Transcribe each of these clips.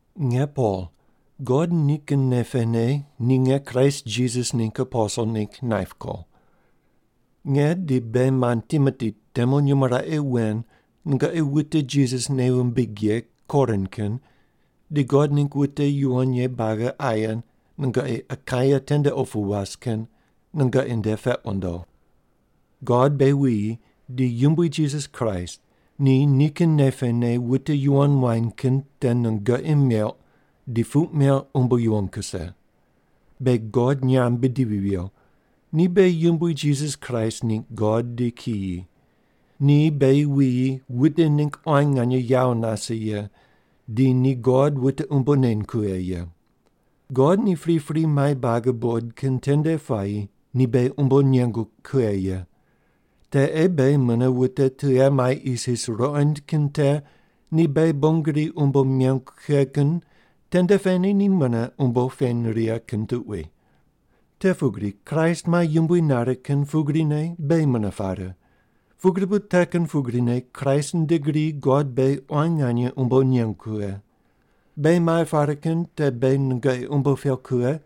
Nge Pol, God nikin nei pene ni nge Kraist Jisas ningg aposel ningg naip ko. Nge di beghi mand Timoti temu nyumo raqe wen nungoqi wute Jisas nei wumbig ye Korin kin di God ningg wute yuwon ye buagi aye nungoqi Akaia tende opu was kin nungoqi nde peq wundo. God beghi wuyi di Yumbui Jisas Kraist ni nikin nei pene wute yuwon muany kin te nungoqi meuq di puq meuq umbo yuwon kuse. Beghi God nyamb bidivi viyo. Ni beghi Yumbui Jisas Kraist ningg God di kiyi. Ni beghi wuyi wute ningg quan nganye yawo nase ye, di ni God wute umbo neny kughe ye. God ni pripri mai buagi buqod kin tende puayi ni beghi umbo nengu kughe ye. Te ei beghi mune wute tughe mai isis ruqond kin te ni beghi bon gri umbo nengu kughe kin tende pene ni mune umbo peny righe kin tuqui. Te pugri Kraist mai yumbui nare kin pugrine beghi mune pare, pugri bu te kin pugrine Kraist nde gri God beghi quan nganye umbo nengu kughe. Beghi mai pare kin te beghi nungoqi umbo peuq kughe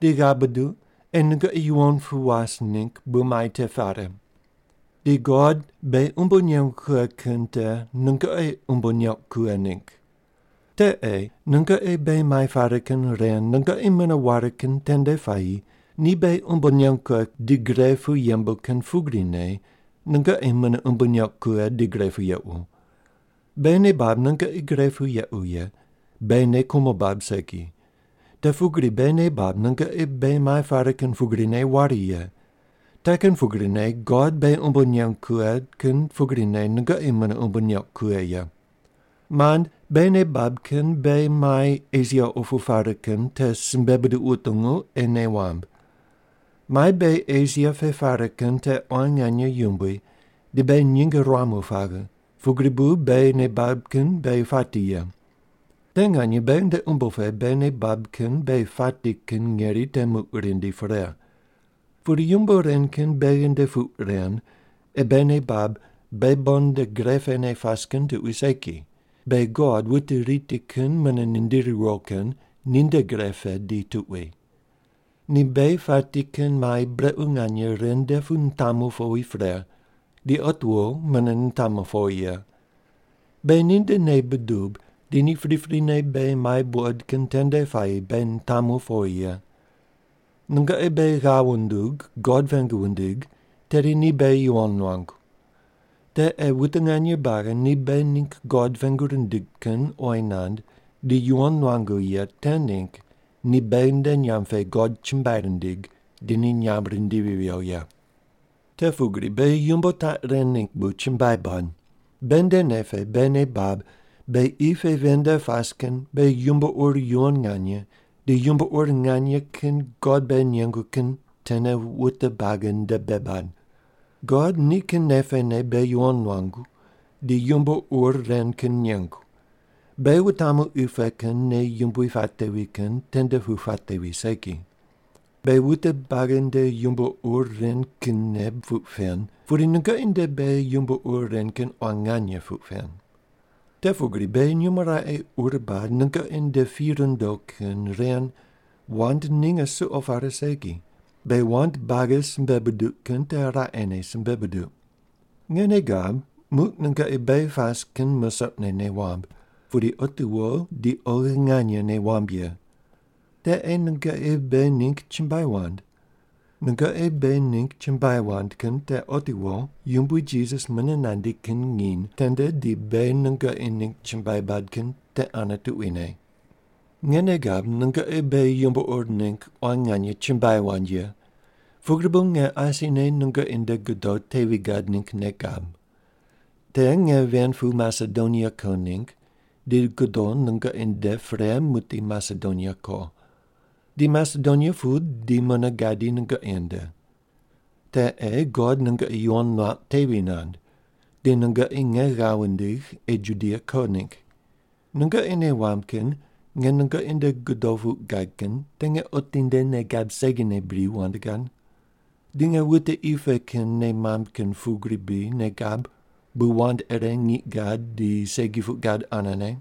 di ghav buduq ei nungoqi yuwon pu was ningg bu mai te pare. Di God beghi umbo nengu kughe kin te nungoqi umbo neuq kughe ningg. Te ei nungoqi beghi mai pare kin ren nungoqi mune ware kin tende puayi ni beghi umbo nengu kughe di gre pu yembu kin pugrine nungoqi mune umbo neuq kughe di gre pu yequ. Beghi nei bab nungoqi gre pu yequ ye, beghi nei kumo bab segi. Te pugri beghi nei bab nungoqi beghi mai pare kin pugrine ware ye, te kin pugrine God beghi umbo nengu kughe kin pugrine nungoqi mune umbo neuq kughe ye. Mand, beghi nei bab kin beghi mai Esia opu pare kin te simbe buduq wutungu ei nei wamb. Mai beghi Esia pe pare kin te quan nganye yumbui di beghi nyinge ruamu paghe, pugri bu beghi nei bab kin beghi pati ye. Te nganye beghi nde umbo pe beghi nei bab kin beghi pati kin ngeri te muq rindi pre. Pudi yumbo ren kin beghi nde puq ren ei beghi nei bab beghi bon nde gre pene pas kin tuqui segi, beghi God wute riti kin mune nindiri riwo kin ninde gre pe di tuqui. Ni beghi pati kin mai brequ nganye ren nde pu nitamu powi pre, di otiwo mune nitamu powi ye. Beghi ninde nei budub di ni priprine beghi mai buqod kin tende puayi beghi nitamu powi ye. Nungoqi beghi ghav wundug God pengu wundig tedi ni beghi yuwon nuangu. Te ei wute nganye buagi ni beghi ningg God pengu rindig kin oyi nand di yuwon nuangu ye te ningg ni beghi nde nyamb pe God chumbuai rindig di ni nyamb rindivi viyo ye. Te pugri beghi yumbo taq ren ningg bu chumbuai bad: Beghi nde nei pe beghi nei bab beghi qi pe ven nde pas kin beghi yumbo ur yuwon nganye di yumbo ur nganye kin God beghi nengu kin tene wute buagi nde bei bad. God nikin nei pene beghi yuwon nuangu di yumbo ur ren kin nengu, beghi wutamu qi pe kin nei yumbui patevi kin tende pu patevi segi. Beghi wute buagi nde yumbo ur ren kinne puq pen, pudi nungoqi nde beghi yumbo ur ren kin quan nganye puq pen. Te pugri beghi nyumo raqe ur bad nungoqi nde pi rundo kin ren wand ninge suqo pare segi, beghi wand buagi simbe buduq kin te raqene simbe buduq. Nge nei gab, muq nungoqi beghi pas kin musoqne nei wamb, pudi otiwo di oghine nganye nei wamb ye. Te ei nungoqi beghi ningg chumbuai wand. Nungoqi beghi ningg chumbuai wand kin te otiwo Yumbui Jisas mune nandi kin nginy tende di beghi nungoqi ningg chumbuai bad kin te ane tuquine. Nge nei gab nungoqi beghi yumbo ur ningg quan nganye chumbuai wand ye, pugri bu nge asine nungoqi nde godo tevi gad ningg nei gab. Te nge ven pu Masedonia ko ningg di godo nungoqi nde pre muqdi Masedonia ko. Di Masedonia pu di mune gadi nungoqi nde. Te ei God nungoqi yuwon nuauq tevi nand, di nungoqi nge ghav wundigh ei Judia ko ningg. Nungoqi nei wamb kin nge nungoqi nde godo puq gad kin te nge otinde nei gab segine bri wand gad? Di nge wute qi pe kin nei mamb kin pugri bri nei gab bu wand ire ngiq gad di segi puq gad anene?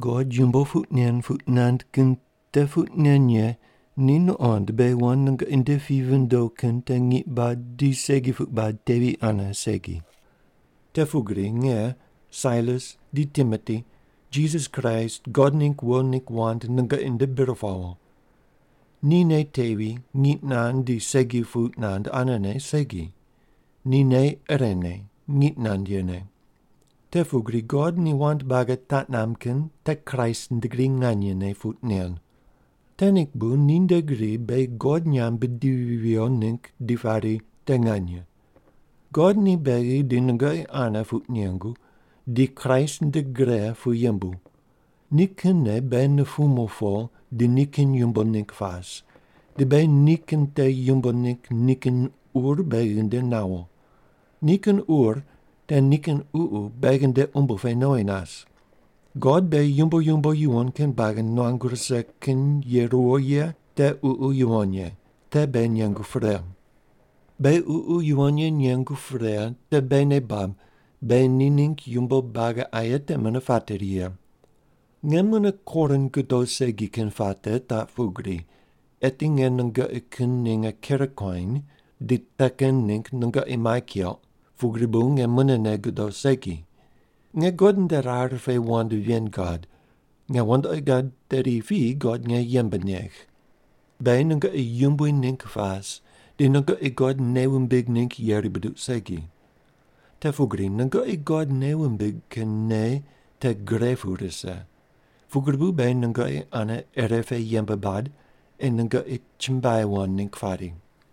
God yumbo puq nen puq nand kin te puq nen ye ni nuqond beghi wand nungoqi nde pi vindo kin te ngiq bad di segi puq bad tevi ane segi. Te pugri nge, Sailas di Timoti Jisas Kraist God ningg wo ningg wand nungoqi nde bir pawo. Ni nei tevi, ngiq nand di segi puq nand anene segi. Ni nei irene, ngiq nand yene. Te pugri God ni wand buagi taq namb kin te Kraist nde gri nganyene puq nen. Te ningg bu ninde gri beghi God nyamb bidivi viyo ningg di pari, “Te nganye.” God ni beghi di nungoqi ane puq nengu di Kraist nde gre pu yembu. Ni kinne beghi nupumu po di nikin yumbo ningg pas, di beghi ni kin te yumbo ningg nikin ur beghi nde nawo. Nikin ur te nikin Ququ beghi nde umbo pe nowi nas. God beghi yumbo yumbo yuwon kin buagi nuangu rise kin ye ruwo ye te Ququ Yuwon Ye, te beghi nengu pre. Beghi Ququ Yuwon Ye nengu pre te beghi nei bab beghi ni ningg yumbo buagi aye te mune pateri ye. Nge mune Korin godo segi kin puate taq pugri, eti nge nungoqi kin ninge ker kuany di te kin ningg nungoqi mai keuq, pugri bu nge munene godo segi. Nge God nde rar pe wand ven gad, nge wandoqi gad tedi piyi God nge yembe negh. Beghi nungoqi yumbui ningg pas di nungoqi God nei wumbig ningg yeri buduq segi. Te pugri nungoqi God nei wumbig kin nei te gre pu rise, pugri bu beghi nungoqi ane irepe yembe bad ei nungoqi chumbuai wand ningg pari.